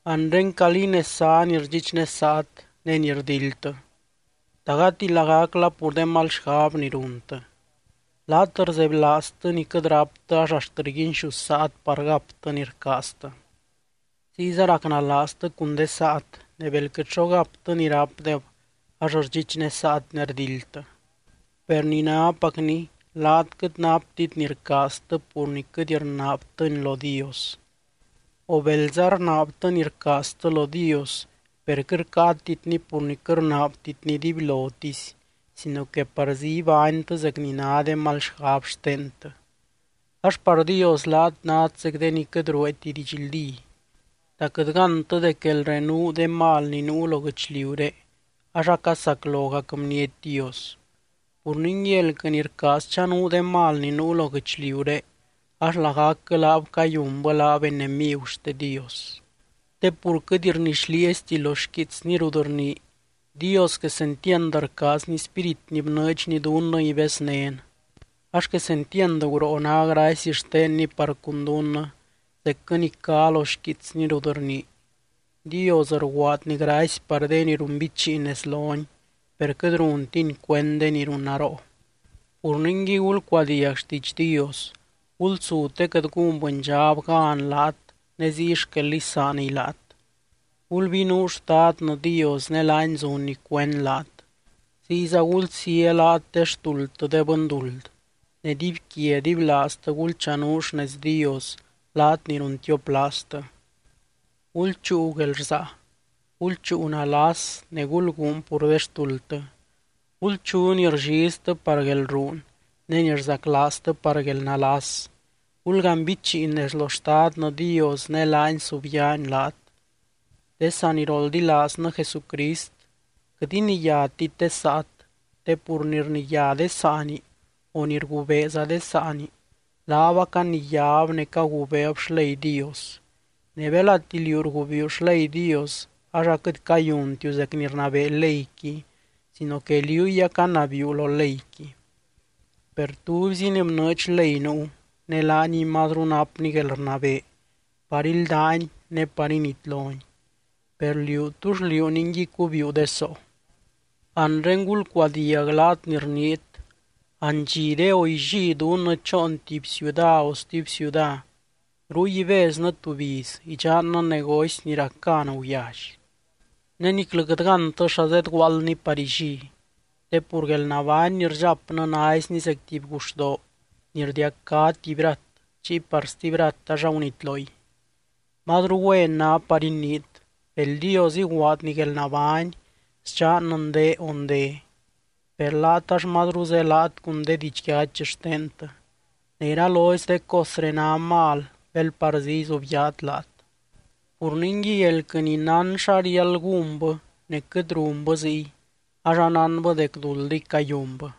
Anre, ¿calí nez zá ni rdxichnesaat, ne ni rdildtɨ? ¿Ta gati lagacla pur de mal xgab ni runtɨ? Laat rzebylaaztɨ ni quɨt ráptɨ ax axt rguinxusaat par gaptɨ ni rcaaztɨ. Ziyza racnalaaztɨ cun de saat, ne bel quɨt xo gaptɨ ni rápdeb ax rdxichnesaat ne rdildtɨ. Per ni nápacni laat quɨt naptit ni rcaaztɨ pur ni quɨt rnaabtɨni lo Dios. O belza rnaabtɨ ni rcaaztɨ lo Dios, per quɨt rcáatitni pur ni quɨt rnaabtitni dibylotisy sino que parzí ibánytɨ zec ni ná de mal xgab xtentɨ. Ax par Dios laat nát zec de ni quɨt rueeti didxldí. ¿Ta quɨt gántɨ dec guelrenuu de mal ni nuu lo guɨchliuré ax acasaclogac bniety Dios? Pur ningui, elquɨ ni rcaaz chanuu de mal ni nuu lo guɨchliuré, ax lagacquɨ laab cayunbɨ laab enemigu xte Dios. Te pur quɨt rnixlieesti lo xquiitsny rut rnii: “Dios quesentiand rcaazny spírit ni bnɨɨdxny dunnɨ ibeznén.” Ax quesentiand guroo ná gracy xtenny par cun dunnɨ, zecquɨ ni cá lo xquiitsny rut rnii: “Dios rguaadny gracy par de ni runbichiin nez lony, per quɨt runtiny cuend de ni runnaroo.” Pur ningui gulcuadiag xtiidx Dios. Gulsu te quɨt gún bɨndxab gan laat ne ziy xquel isaaniy laat. Gulbinuu Xtadnɨ Dios ne laany zunny cuend laat. Ziyza gulsía laat de xtuldtɨ de bɨnduld. Ne dibyquia dibylaaztɨ gulchanuu xnez Dios laat ni runtioplaaztɨ. Gulchúu guelrsaa, gulchúu nalas ne gulguun pur de xtuldtɨ. Gulchu ni rlliztɨ par guelruun ne ni rzaclaaztɨ par guelnalas. Gulganbichiin nez lo Xtadnɨ Dios, ne laany subyaany laat. De saniroldilaaznɨ Jesucrist, quɨt iniyátit de saat. Te pur ni rniyá de saani, o ni rgubeeza de saani, laab acaniyáb ne cagubeeb xley Dios. Ne belati liú rgubiiu xley Dios, ax aquɨt cayuntiu zec ni rnabee leyqui sino que liúy acanabiiu lo leyqui. Per tubyzi ni bnɨɨdx ley nuu, ne laaniy mazru napny guelrnabee par íldany ne par initlony. Per liú, ¿túll liú ningui cubiiu de soo? Anre gulcuadiag laat ni rniit: “Andxiré o illí dunnɨ choon tuby ciuda o stuby ciuda. Ruy ibeznɨ tuby iz, idxannɨ negocy ni rac gan guyally.” Ne niclɨ quɨt gántɨ xa zedguaaldni par illí. Te pur guelnabány ni rdxapnɨ naizni zec tuby guxdoo ni rdiacá tuby rat, chiy par stuby rat ax agunitloy. Mazru güen ná par iniit: “Bel Dios iguaadny guelnabány, sdxannɨ ndee o nde.” Per laat ax mazru zelaat cun de didxyachy xtentɨ, ne iralozy de cosré ná mal bel parzí izubyaat laat. Pur ningui elquɨ ni nán xa riáld gúnbɨ ne quɨt runbɨ ziy, ax anánbɨ dec duldiy cayunbɨ.